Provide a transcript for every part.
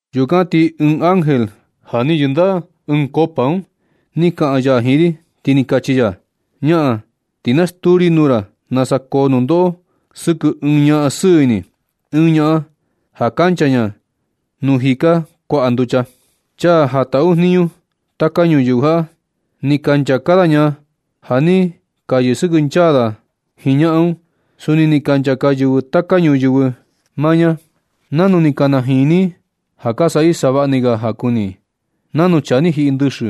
Yukan ti ɨɨn ángel ja ni yɨndaꞌa ɨɨn koꞌo un ni kaꞌan ya jiin ri, ti ni kachi ya: ―Ñaꞌan, ti na stuu ri nuu ra nasa koo nundoꞌo sɨkɨ ɨɨn ñaꞌan sɨɨ ini, ɨɨn ñaꞌan ja kancha ña nuu jika kuaꞌa nducha. Chaa ja ka taꞌu jniñu taka ñuyɨvɨ jaꞌa, ni ka nchaka da ña ja ni ka yɨsɨkɨnchaa da jiin ñaꞌan un. Suni ni ka nchaka yɨvɨ taka ñuyɨvɨ maa ña. Nanu ni ka najini i ja ka saꞌa i savaꞌni ga ja kuni i, nanu chaa ni jiꞌi ndɨxɨ,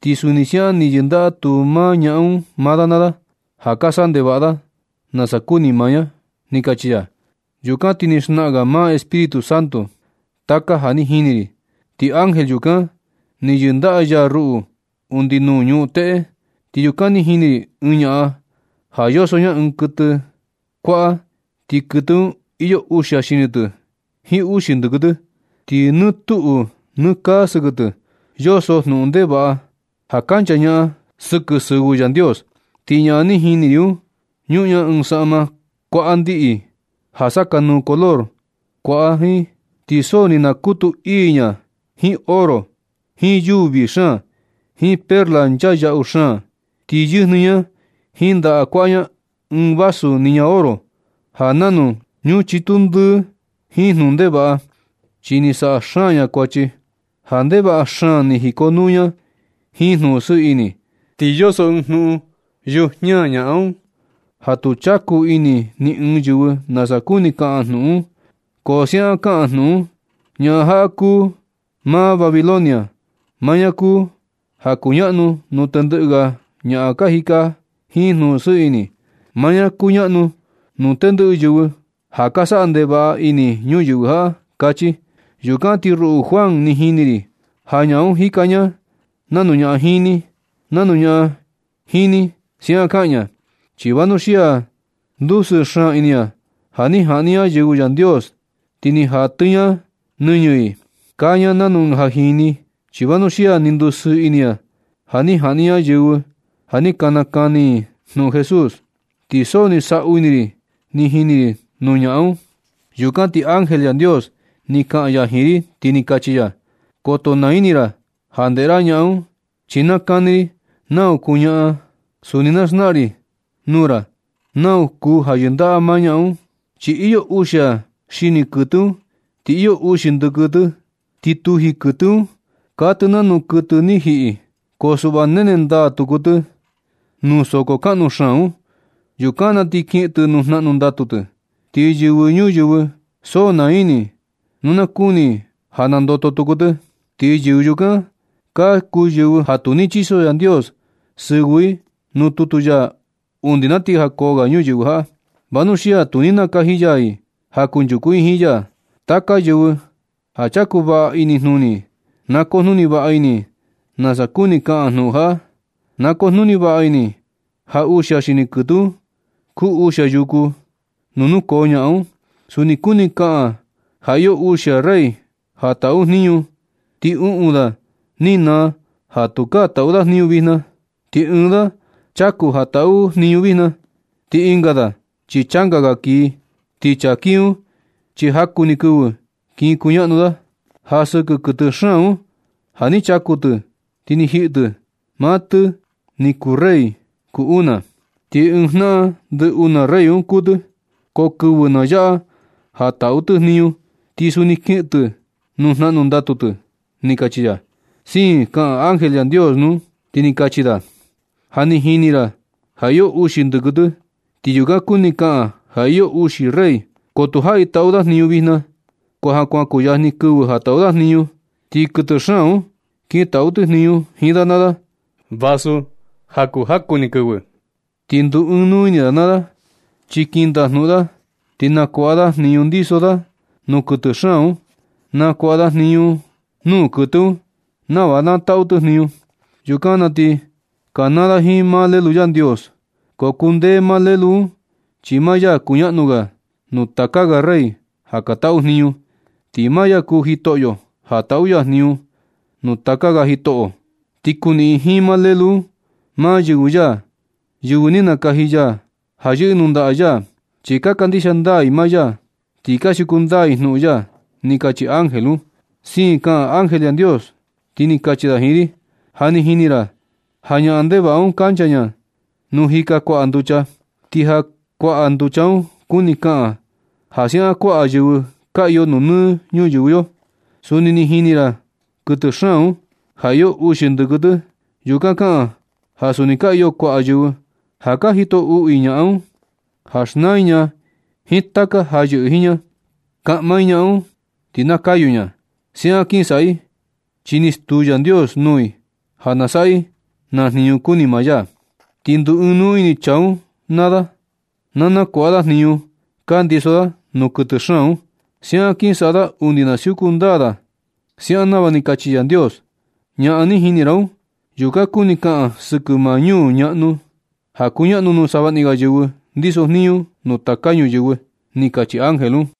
ti suni siaꞌan ni yɨndaꞌa tu maa ñaꞌan un maa da naa da, ja ka saꞌa ndevaꞌa da nasa kuni maa ña ―ni kachi ya. Yukan ti ni xnaꞌan ga maa Espíritu Santu taka ja ni jini ri, ti ángel yukan ni yɨndaꞌa ya ruꞌu undi nuu ñuꞌun teꞌe. Ti yukan ni jini ri ɨɨn ñaꞌan ja yoso ña ɨɨn kuɨtɨ kuaꞌa, ti kuɨtɨ un iyo uxia xini tɨ jiin uxi ndɨkɨ tɨ. Ti nɨ tuꞌu nɨ kaa sɨkɨ tɨ yoso jnuꞌun ndevaꞌa ja kanchañaꞌan sɨkɨ sɨvɨ Yandios. Ti ñaꞌan ni jini ri un, ñuꞌun ña ɨɨn saꞌma kuaꞌa ndiꞌi ja sakanuu color kuaꞌa jiin. Ti so ni nakutu ii ña jiin oro jiin yuu vii xaan, jiin perla nchaa yaꞌu xaan. Ti yɨjnɨ ña jiin ndaꞌa kuaꞌa ña ɨɨn vaso niña oro ja nanu ñuchitu ndɨɨ jiin jnuꞌun ndevaꞌa, chi ni saꞌa xaan ña kuachi ja ndevaꞌa xaan ni jikonuu ña jiin jnuꞌun sɨɨ ini. Ti yoso ɨɨn jnuꞌun yujiña ñaꞌan un, ja tu chaku ini ni ɨɨn yɨvɨ nasa kuni kaꞌan jnuꞌun un. Ko siaꞌan kaꞌan jnuꞌun un: “Ñaꞌan jaꞌa kuu maa Babilonia. Maa ña kuu ja kuñaꞌnu nuu tendɨꞌɨ ga ñaꞌan ja ka jika jiin jnuꞌun sɨɨ ini. Maa ña kuñaꞌnu nuu tendɨꞌɨ yɨvɨ ja ka saꞌa ndevaꞌa ini ñuyɨvɨ jaꞌa”, kachi. Yukan ti ruꞌu Juan, ni jini ri ja ñaꞌan un jika ña nanu ñaꞌan jini. Nanu ñaꞌan jini siaꞌan kaa ña, chi vanuxia ni ndusɨɨ xaan ini ña ja ni jaꞌni ña yɨvɨ Yandios, ti ni jatɨ ña nɨñɨ i. Kaa ña nanu ɨɨn ja jini, chi vanuxia ni ndusɨɨ ini ña ja ni jaꞌni ña yɨvɨ ja ni ka nakani i jnuꞌun Jesús. Ti so ni saꞌu ii ini ri ni jini ri nuu ñaꞌan un. Yukan ti ángel Yandios ni kaꞌan ya jiin ri ti ni kachi ya: ―Koto naa ini ra ja ndeꞌe ra ñaꞌan un. Chi na kani ri nau kuu ñaꞌan. Suni na xnaꞌan ri nuu ra nau kuu ja yɨndaꞌa maa ñaꞌan un. Chi iyo uxia xini kuɨtɨ un ti iyo uxi ndɨkɨ tɨ. Ni tuji kuɨtɨ un ti kaa tɨ nanu kuɨtɨ ni jiꞌi. Ko suꞌva nene ndaa tuku tɨ nuu soko kunu xaan un. Yukan na ti kiꞌin tɨ nuu jnaꞌnu ndatu tɨ. Ti yɨvɨ ñuyɨvɨ so naa ini i nu na kuni i ja nandoto tuku tɨ. Ti yɨvɨ yukan ka kuu yɨvɨ ja tu ni chiso Yandios sɨvɨ i nuu tutu ya undi na ti jakoo ga ñuyɨvɨ jaꞌa. Vanuxia tu ni nakaji ya i ja kunchuku i jiin ya. Taka yɨvɨ ja chaku vaꞌa inijnuni i na kujnuni vaꞌa ini i nasa kuni kaꞌan jnuꞌun jaꞌa. Na kujnuni vaꞌa ini i ja uxia xini kuɨtɨ un kuu uxia yuku nuu nukoo ñaꞌan un. Suni kuni kaꞌan un ja iyo uxia rey ja taꞌu jniñu. Ti uꞌun da ni naa ja tukaa taꞌu da jniñu vijna. Ti ɨɨn da chaku ja taꞌu jniñu vijna. Ti ɨnga da chi changa ga kii. Ti chaa kii un, chi jaku ni kɨvɨ kin kuñaꞌnu da. Ja sɨkɨ kuɨtɨ xaan un ja ni chaku tɨ ti ni jiꞌi tɨ, maa tɨ ni kuu rey kuu una. Ti ɨɨn jnaꞌan ndɨ una rey un kuū tɨ. Ko kɨvɨ na yaꞌa ja taꞌu tɨ jniñu, ti suni kiꞌin tɨ nuu jnaꞌnu ndatu tɨ ―ni kachi ya. Siin kaꞌan ángel Yandios un, ti ni kachi da: ―Ja ni jini ra ja iyo uxi ndɨkɨ tɨ. Ti yukan kuni kaꞌan ja iyo uxi rey. Ko tu jaꞌi taꞌu da jniñu vijna, ko ja kuan kuyajni kɨvɨ ja taꞌu da jniñu. Ti kuɨtɨ xaan un kin taꞌu tɨ jniñu jiin da naa da, vasu ja kuu jaku ni kɨvɨ ni. Ti nduu ɨɨn nuu ini da naa da chi kin ndajnuꞌun da, ti nakuaꞌa da jniñu ndiso da nuu kuɨtɨ xaan un. Nakuaꞌa da jniñu nuu kuɨtɨ un nava na taꞌu tɨ jniñu. Yukan na ti kanaa da jiin maa Lelu Yandios, ko kundee maa Lelu un. Chi maa ya kuñaꞌnu ga nuu taka ga rey ja ka taꞌu jniñu. Ti maa ya kuu Jitoꞌyo ja taꞌu ya jniñu nuu taka ga jitoꞌo. Ti kuꞌiin jiin maa Lelu un maa yɨvɨ ya, yɨvɨ ni nakaji ya ja kɨꞌɨ nuu ndaꞌa ya. Chi ka kandixia ndaa i maa ya ti ka siuku ndaa i jnuꞌun ya ―ni kachi ángel un. Siin kaꞌan ángel Yandios ti ni kachi da jiin ri: ―Ja ni jini ra ja ñaꞌan ndevaꞌa un kancha ña nuu jika kuaꞌa nducha. Ti ja kuaꞌa nducha un kuni kaꞌan ja siaꞌan kuaꞌa yɨvɨ ka iyo nuu nɨ ñuyɨvɨ yo. Suni ni jini ra kuɨtɨ xaan un, ja iyo uxi ndɨkɨ tɨ. Yukan kaꞌan ja suni ka iyo kuaꞌa yɨvɨ ja ka jito uꞌu i ñaꞌan un, ja xnaa i ña jiin taka ja yɨꞌɨ jiin ña, kaꞌma i ñaꞌan un ti na kayu ña. Siaꞌan kin saꞌa i, chi ni stuu Yandios nuu i ja na saꞌa i naa jniñu kuni maa ya. Ti nduu ɨɨn nuu ini chaa un naa da ja nakuaꞌa da jniñu ka ndiso da nuu kuɨtɨ xaan un. Siaꞌan kin saꞌa da undi na siuku ndaa siaꞌan nava ni kachi Yandios. Ñaꞌan ni jini ra un, yukan kuni kaꞌan sɨkɨ maa ñuu ñaꞌnu ja kuñaꞌnu nuu savaꞌni ga yɨvɨ ndisojniñu nuu taka ñuyɨvɨ ―ni kachi ángel un.